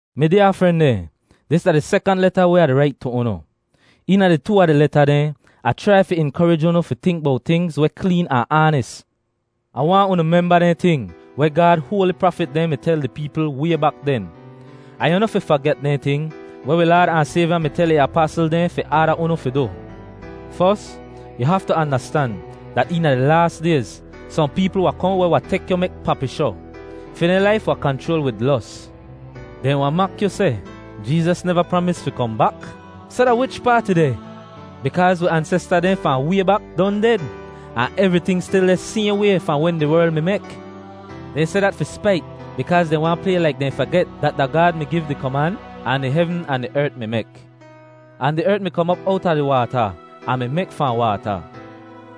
Mi dyaa fren dehn, dis da di sekant leta weh Ah di rait tu unu. Eena di too a di leta dehn Ah chrai fi inkorij unu fi tink bowt tingz weh kleen ahn aanis. Ah waahn unu memba dehn ting weh Gaad hoali prafit dehn mi tel di peepl way bak den. Ahn yu noh fi faget dehn ting weh wi Laad ahn Sayvya mi tel ih apasl dehn fi aada unu fi du. Fos, yu haftu andastan dat eena di laas dayz sohn peepl wahn kohn weh wahn tek yu mek papishoh. Fi dehn laif wahn kanchroal wid los. Dehn wahn mak yu seh, “Jeezas neva pramis fi kohn bak? Soh da wichpaat ih deh? Bikaaz wi ansesta dehn fahn way bak don ded, ahn evriting stil deh sayhn way fahn wen di werl mi mek.” Dehn seh dat fi spait bikaaz dehn waahn play laik dehn faget dat da Gaad mi giv di koman, ahn di hevn ahn di ert mi mek. Ahn di ert mi kom op owta di waata ahn mi mek fahn waata.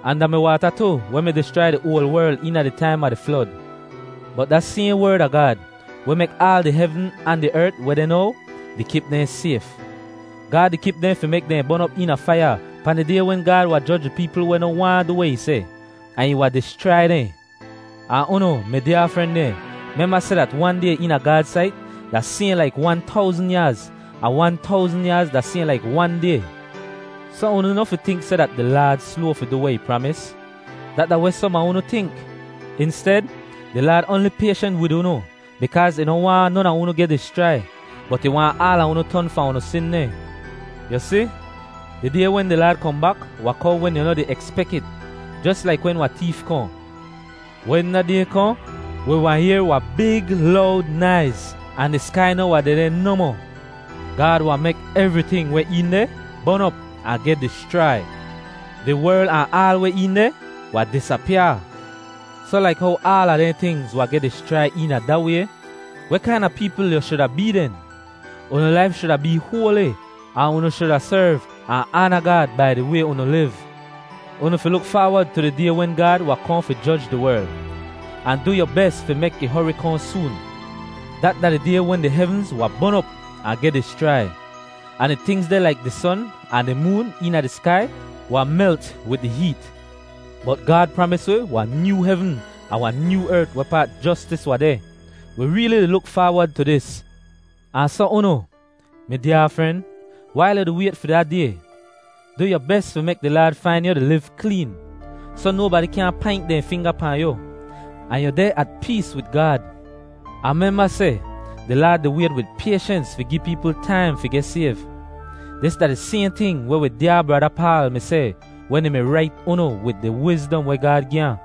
Ahn da mi waata tu weh mi dischrai di oal werl eena di taim a di flod. Bot da sayhn Werd a Gaad, weh mek aal di hevn ahn di ert weh deh now, di kip dehn sayf. Gaad di kip dehn fi mek dehn bon op eena faiya pahn di Day wen Gaad wahn joj di peepl weh noh waahn du weh ih seh, ahn ih wahn dischrai dehn. Ahn unu, mi dyaa fren dehn, memba seh dat wan day eena Gaad sait da sayhn laik wan towzn yaaz, ahn wan towzn yaaz da sayhn laik wan day. Soh, unu noh fi tink seh dat di Laad sloa fi du weh ih pramis. Dat da weh som a unu tink. Insted, di Laad oanli payshent wid unu bikaaz ih noh waahn non a unu geh dischrai, bot ih waahn aala unu ton fahn unu sin dehn. Yu si, di Day wen di Laad kohn bak wahn kohn wen yu noh di ekspek it, jos laik wen wahn teef kohn. Wen da Day kohn, wi wahn yehr wahn big lowd naiz ahn di skai noh wahn dehdeh nohmoh. Gaad wahn mek evriting weh een deh bon op ahn geh dischrai. Di werl ahn aal weh een deh wahn disapyaa. Soh laik how aala dehn tingz wahn geh dischrai eena da way, weh kaina peepl yu shuda bee den? Unu laif shuda bee hoali ahn unu shuda serv ahn aana Gaad bai di way unu liv. Unu fi luk faawod tu di Day wen Gaad wahn kohn fi joj di werl, ahn du yu bes fi mek ih hori kohn soon. Dat da di Day wen di hevnz wahn bon op ahn geh dischrai, ahn di tingz dehn laik di son ahn di moon eena di skai wahn melt wid di heet. Bot Gaad pramis wi wahn nyoo hevn ahn wahn nyoo ert wehpaat jostis wahn deh. Wi reeli di luk faawod tu dis. Ahn soh unu, mi dyaa fren, wail yu di wayt fi da Day, du yu bes fi mek di Laad fain yu di liv kleen, soh nobadi kyaahn paint dehn finga pahn yu, ahn yu deh at pees wid Gaad. Ahn memba seh di Laad di wayt wid payshens fi gi peepl taim fi geh sayv. Dis da di sayhn ting weh wi dyaa brada Paal mi seh wen ih mi rait unu wid di wizdom weh Gaad gi ahn.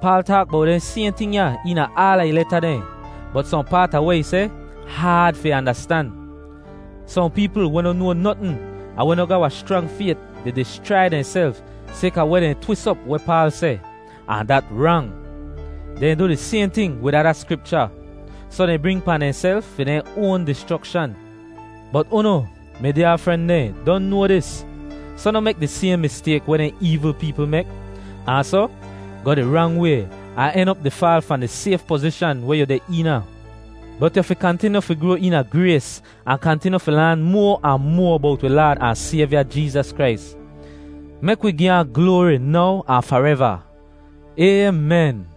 Paal taak bowt dehn sayhn ting ya eena aala ih leta dehn, bot sohn paat a weh ih seh haad fi andastan. Sohn peepl weh noh noa notn ahn weh noh ga wahn schrang fayt di dischrai dehnself sayka weh dehn twis op weh Paal seh, ahn dat rang. Dehn du di sayhn ting wid ada Skripcha. Soh dehn bring pahn dehnself fi dehn oan dischrokshan. Bot unu, mi dyaa fren dehn, don noa dis. Soh noh mek di sayhn mistayk weh dehn eevl peepl mek ahn soh goh di rang way ahn en op di faal fahn di sayf pozishan weh yu deh eena. Bot yu fi kantinyu fi groa eena grays ahn kantinyu fi laan moa ahn moa bowt wi Laad ahn Sayvya Jeezas Krais. Mek wi gi ahn gloari now ahn fareva. Aymen.